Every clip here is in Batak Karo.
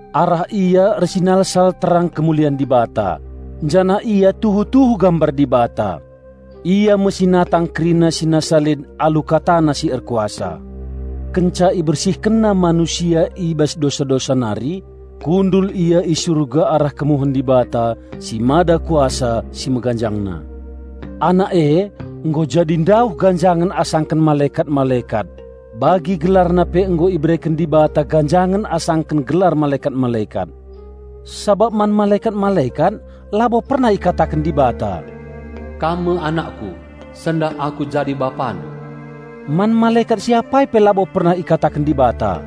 Arah Ia ersinalsal terang kemulian Dibata, janah Ia tuhu-tuhu gambar Dibata. Ia me si natang kerina si nasa lit alu KataNa si erkuasa. Kenca IbersihkenNa manusia i bas dosa-dosa nari, kundul Ia i surga arah kemuhen Dibata si Mada Kuasa si meganjangna. Anak e nggo jadi ndauh ganjangen asangken malekat-malekat, bagi GelarNa pe nggo ibereken Dibata ganjangen asangken gelar malekat-malekat. Sabap man malekat-malekat labo pernah ikataken Dibata, "Kam me anakKu; sendah Aku jadi Bapandu." Man malekat si apai pe labo pernah ikataken Dibata,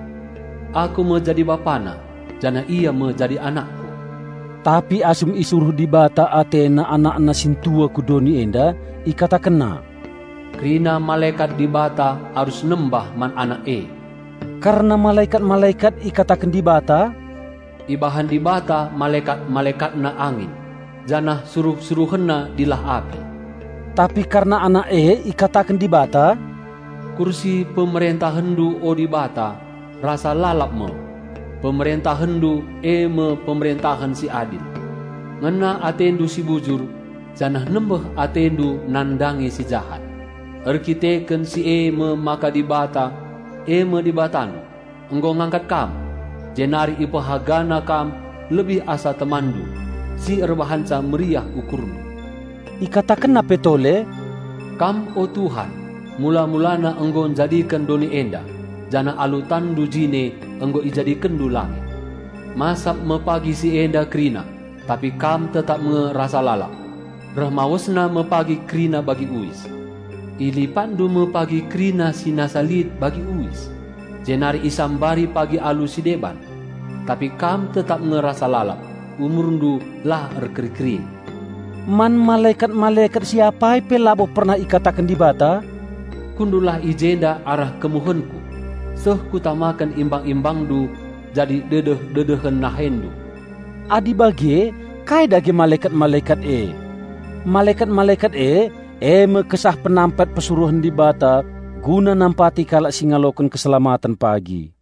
"Aku me jadi BapaNa, janah Ia me jadi AnakKu." Tapi asum isuruh Dibata AteNa AnakNa sintua ku doni enda, IkatakenNa, "Kerina malekat Dibata arus nembah man Anak e." Kerna malekat-malekat ikataken Dibata, "Ibahan Dibata malekat-MalekatNa angin, janah suruh-SuruhenNa dilah api." Tapi kerna Anak e ikataken Dibata, "Kursi PemerentahenNdu o Dibata, rasa lalap me! PemerentahenNdu e me pemerentahen si adil. Ngena atendu si bujur, janah nembeh atendu nandangi si jahat; erdandanken si e me maka Dibata, e me Dibatandu, nggo ngangkat Kam, jenari IpehagaNa Kam lebih asa TemanNdu, si erbahanca meriah UkurNdu." IkatakenNa pe tole, "Kam o Tuhan, mula-mulana nggo njadiken doni enda, janah alu TanNdu jine nggo IjadikenNdu langit. Masap me pagi si enda kerina, tapi Kam tetap nge rasa lalap; reh mawesna me pagi kerina bagi uis. IlipatNdu me pagi kerina si nasa lit bagi uis, jenari isambari pagi alu si deban. Tapi Kam tetap nge rasa lalap, UmurNdu la erkeri-kerin." Man malekat-malekat si apai pe labo pernah ikataken Dibata, "Kundullah i jenda arah kemuhenKu, seh kutamaken imbang-ImbangNdu jadi dedeh-dedehen NaheNdu." Adi bage kai dage malekat-malekat e? Malekat-malekat e, e me kesah penampat persuruhen Dibata guna nampati kalak si ngaloken keselamaten pagi.